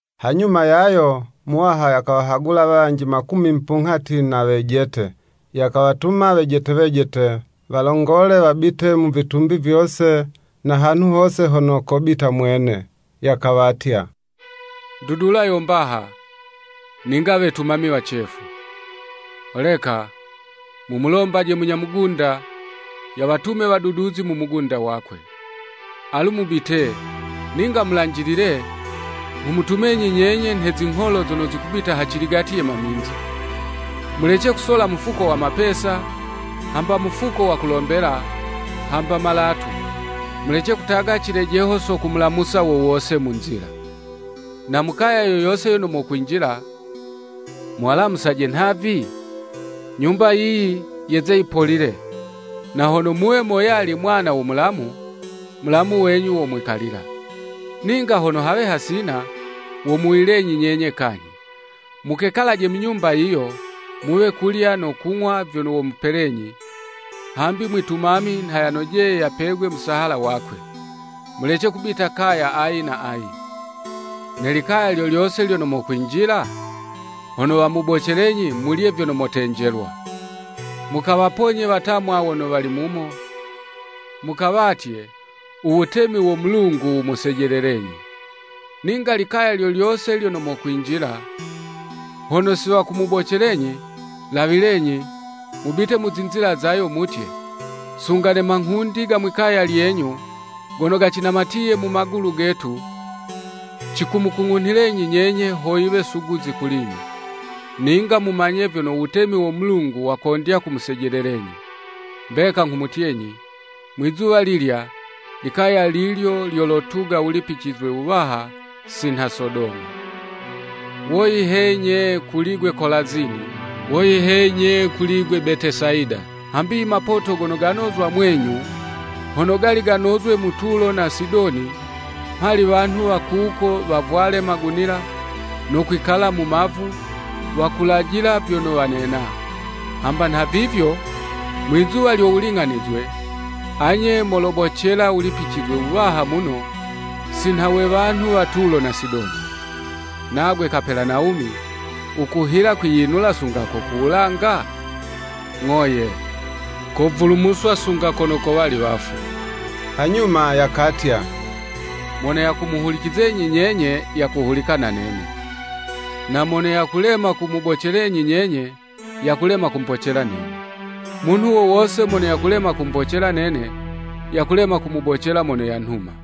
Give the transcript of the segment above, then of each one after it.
Hanyuma yayo Muwaha yakawahagula wanji makumi mupunghati na wejete, yakawatuma wejete wejete, walongole wabite mu vitumbi vyose na hanhu hose hono kobita mwene. Yakawatya, “Ndudula yo mbaha, ninga wetumami wacefu. Holeka, mumulombaje munya mugunda, yawatume waduduzi mu mugunda wakwe. Alu mubite, ninga mulanjilile, nghumutumenyi nyenye nhe zingholo zono zikubita haciligati ye maminzi. Mulece kusola mufuko wa mapesa, hamba mufuko wo kulombela, hamba malatu: mulece kutaga cilejeho so kumulamusa wowose mu nzila. Na mu kaya yo yose yono mokwinjila muwalamusaje nhavi, ‘Nyumba yiyi yeze yipolile.’ Na hono muwe moyali mwana wo mulamu, mulamu wenyu womwikalila; ninga hono hawe hasina, womuwuyilenyi nyenye kanyhi. Mukekalaje mu nyumba yiyo, muwe kulya no kung'wa vyono womupelenyi; hambi mwitumami nha yanojeye yapegwe musahala wakwe. Mulece kubita kaya ayi na ayi. Ne likaya lyo lyose lyono mokwinjila, hono wamubocelenyi, mulye vyono motenjelwa. Mukawaponye watamwa wono wali mumo, mukawatye, ‘U wutemi wo Mulungu wumusejelelenyi.’ Ninga likaya lyo lyose lyono mokwinjila, hono si wakumubocelenyi, lawilenyi, mubite mu zinzila zayo mutye, ‘Sunga ne manghundi ga mwi'kaya lyenyu gono gacinamatiye mu magulu getu, cikumukung'unhilenyi nyenye, ho yiwe suguzi kuli'nye. Ninga mumanye vyono wutemi wo Mulungu wakondya kumusejelelenyi.’ Mbeka nghumutyenyi, mwizuwa lilya, likaya lilyo lyolotuga wulipicizwe wuwaha si nha Sodoma.” “Woyi he nye kuli'gwe Kolazini! Woyi he nye kuli'gwe Betesayida! Hambi imapoto gono ganozwa mwenyu hono gali ganozwe mu Tulo na Sidoni, mhali wanhu wa kuko wavwale magunila, no kwikala mu mavu, wakulajila vyono wanena. Hamba nhavivyo, mwi'zuwa lyo wuling'anizwe, anye molobocela wulipicizwe wuwaha muno, sinha we wanhu wa Tulo na Sidoni. Nagwe Kapelanawumi wukuhila kwiyinula sunga ko ku wulanga? Ng'o ye, kovulumuswa sunga kono kowali wafu.” Hanyuma yakatya, “Mono yakumuhulicizenyi nyenye, yakuhulika na nene. Na mono yakulema kumubocelenyi nyenye, yakulema kumbocela nene. Munhu wowose mono yakulema kumbocela nene, yakulema kumubocela mono yanhuma.”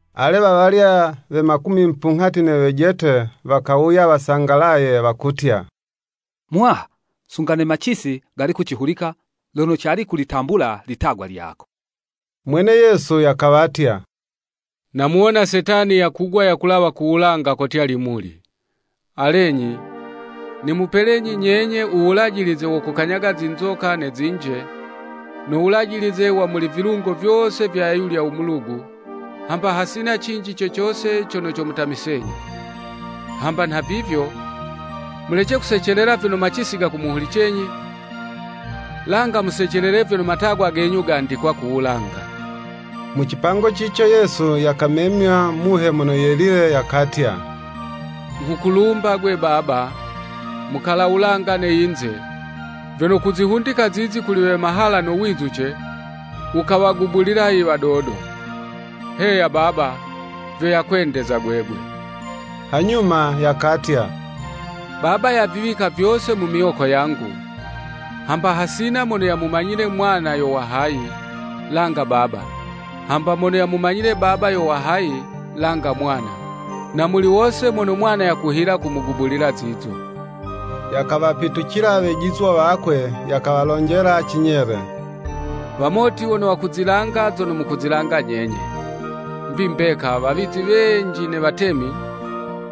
Ale wawalya we makumi mupunghati ne wejete wakawuya wasangalaye, wakutya, “Muwaha, sunga ne macisi gali kucihulika lono cali kulitambula litagwa lyako.” Mwene Yesu yakawatya, “Namuwona Setani yakugwa yakulawa ku wulanga kotya limuli. Alenyi, nimupelenyi nyenye u wulajilize wo kukanyaga zinzoka ne zinje, no wulajilize wa muli vilungo vyose vya ayulya mulugu, hamba hasina cinji co cose cono comutamisenyi. Hamba nhavivyo, mulece kusecelela vyono macisi gakumuhulicenyi; langa musecelele vyono matagwa genyu gandikwa ku wulanga.” Mu cipango cico Yesu yakamemywa Muhe Mono Yelile yakatya; “Nghukulumba, Gwe Baba, Mukala wulanga ne yinze, vyono kuzihundika zizi kuli we mahala no wizuce, wukawagubulila i wadodo, heya Baba, vyo yakwendeza gwegwe.” Hanyuma yakatya, “Baba yaviwika vyose mu miwoko yangu, hamba hasina mono yamumanyile Mwana yo wa hayi, langa Baba, hamba mono yamumanyile Baba yo wa hayi; langa Mwana, na muli wose mono Mwana yakuhila kumugubulila zizo.” Yakawapitucila wejizwa wakwe, yakawalonjela cinyele, “Wamoti wono wakuzilanga zono mukuzilanga nyenye. ‘Mbi mbeka wawizi wenji ne watemi,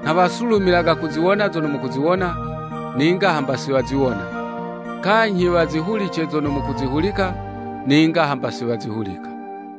nha wasulumilaga kuziwona zono mukuziwona, ninga hamba si waziwona, kanyhi wazihulice zono mukuzihulika, ninga hamba si wazihulika.’”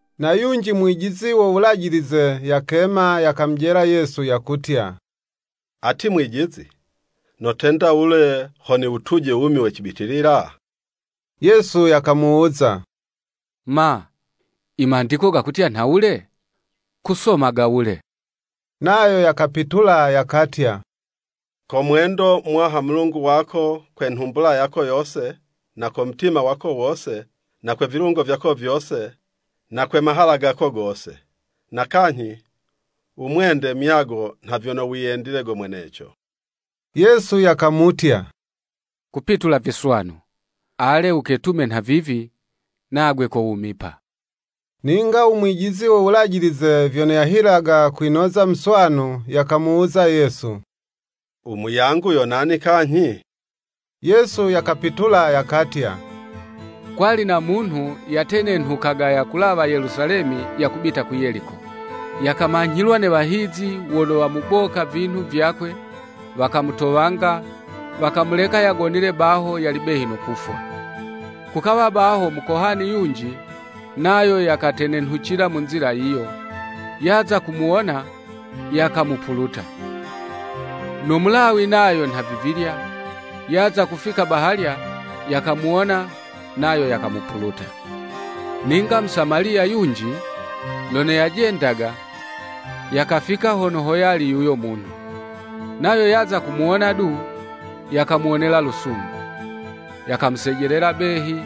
Na yunji mwijizi wo Wulajilize yakema yakamujela Yesu, yakutya, “Ati Mwijizi, notenda wule ho niwutuje u wumi we cibitilila?” Yesu yakamuwuza, “Ma, i Mandiko gakutya nhawule?” Kusomaga wule? Nayo yakapitula yakatya, “Komwendo Muwaha Mulungu wako kwe nhumbula yako yose, na ko mutima wako wose, na kwe vilungo vyako vyose, na kwe mahala gako gose. Na kanyhi wumwende muyago nha vyono wiyendile go mweneco.” Yesu yakamutya, “Kupitula viswanu. Ale, wuketume nhavivi, nagwe kowumipa.” Ninga u mwijizi wo Wulajilize vyono yahilaga kwinoza muswanu, yakamuwuza Yesu, “U muyangu yo nani kanyhi.” Yesu yakapitula yakatya, “Kwali na munhu yatenenhukaga yakulawa Yelusalemi yakubita ku Yeliko, yakamanyhilwa ne wahizi, wono wamuboka vinhu vyakwe, wakamutowanga, wakamuleka yagonile baho yali behi no kufwa. Kukawa baho Mukohani yunji, nayo yakatenenhucila mu nzila yiyo; yaza kumuwona, yakamupuluta. No Mulawi nayo nhavivilya, yaza kufika bahalya, yakamuwona, nayo yakamupuluta. Ninga Musamaliya yunji, lono yajendaga, yakafika hono hoyali yuyo munhu. Nayo yaza kumuwona du, yakamuwonela lusungu. Yakamusejelela behi,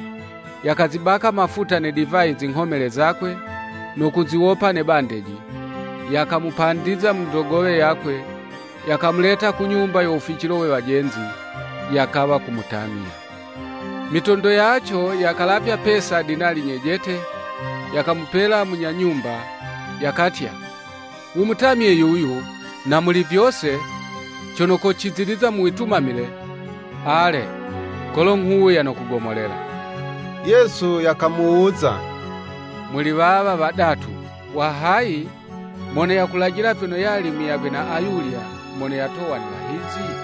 yakazibaka mafuta ne divayi zinghomele zakwe, no kuziwopa ne bandeji, yakamupandiza mu ndogowe yakwe, yakamuleta ku nyumba yo wuficilo we wajenzi, yakawa kumutamya. Mitondo yaco yakalavya pesa dinali nyejete, yakamupela munya nyumba, yakatya, ‘Wumutamye yuyu, na muli vyose, cono kociziliza mu witumamile, ale, kolo nghuwuya nokugomolela.’” Yesu yakamuwuza, “Muli wawa wadatu wa hayi mono yakulajila vyono yali muyagwe na ayulya mono yatowa ne wahizi?”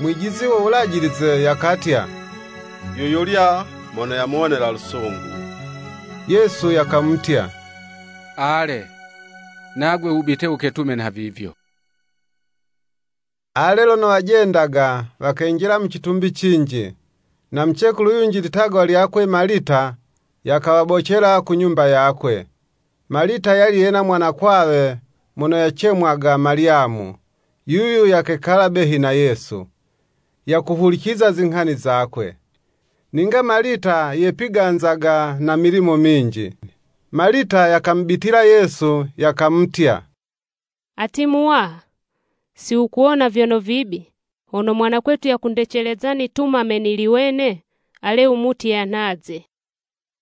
Mwijizi wo Wulajilize yakatya, “Yuyulya mono yamuwonela lusungu.” Yesu yakamutya, “Ale, nagwe wubite wuketume nhavivyo.” Ale, lono wajendaga, wakenjila mu citumbi cinji, na mucekulu yunji litagwa lyakwe Malita, yakawabocela ku nyumba yakwe. Malita yali yena mwanakwawe mono yacemwaga Malyamu, yuyu yakekala behi na Yesu, yakuhuliciza zinghani zakwe. Ninga Malita yepiganzaga na milimo minji. Malita yakamubitila Yesu, yakamutya, “Ati Muwaha, si wukuwona vyono vibi, hono mwanakwetu yakundeceleza nitumame nili wene? Ale wumutye yanhaze.”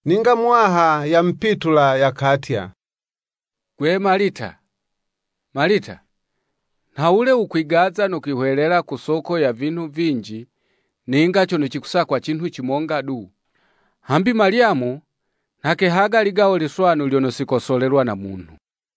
Ninga Muwaha yamupitula yakatya, “Gwe Malita, Malita, nhawule wukwigaza no kwihwelela ku soko ya vinhu vinji, ninga cono cikusakwa cinhu cimonga du; hambi Malyamu nha kehaga ligawo liswanu lyono si kosolelwa na munhu.”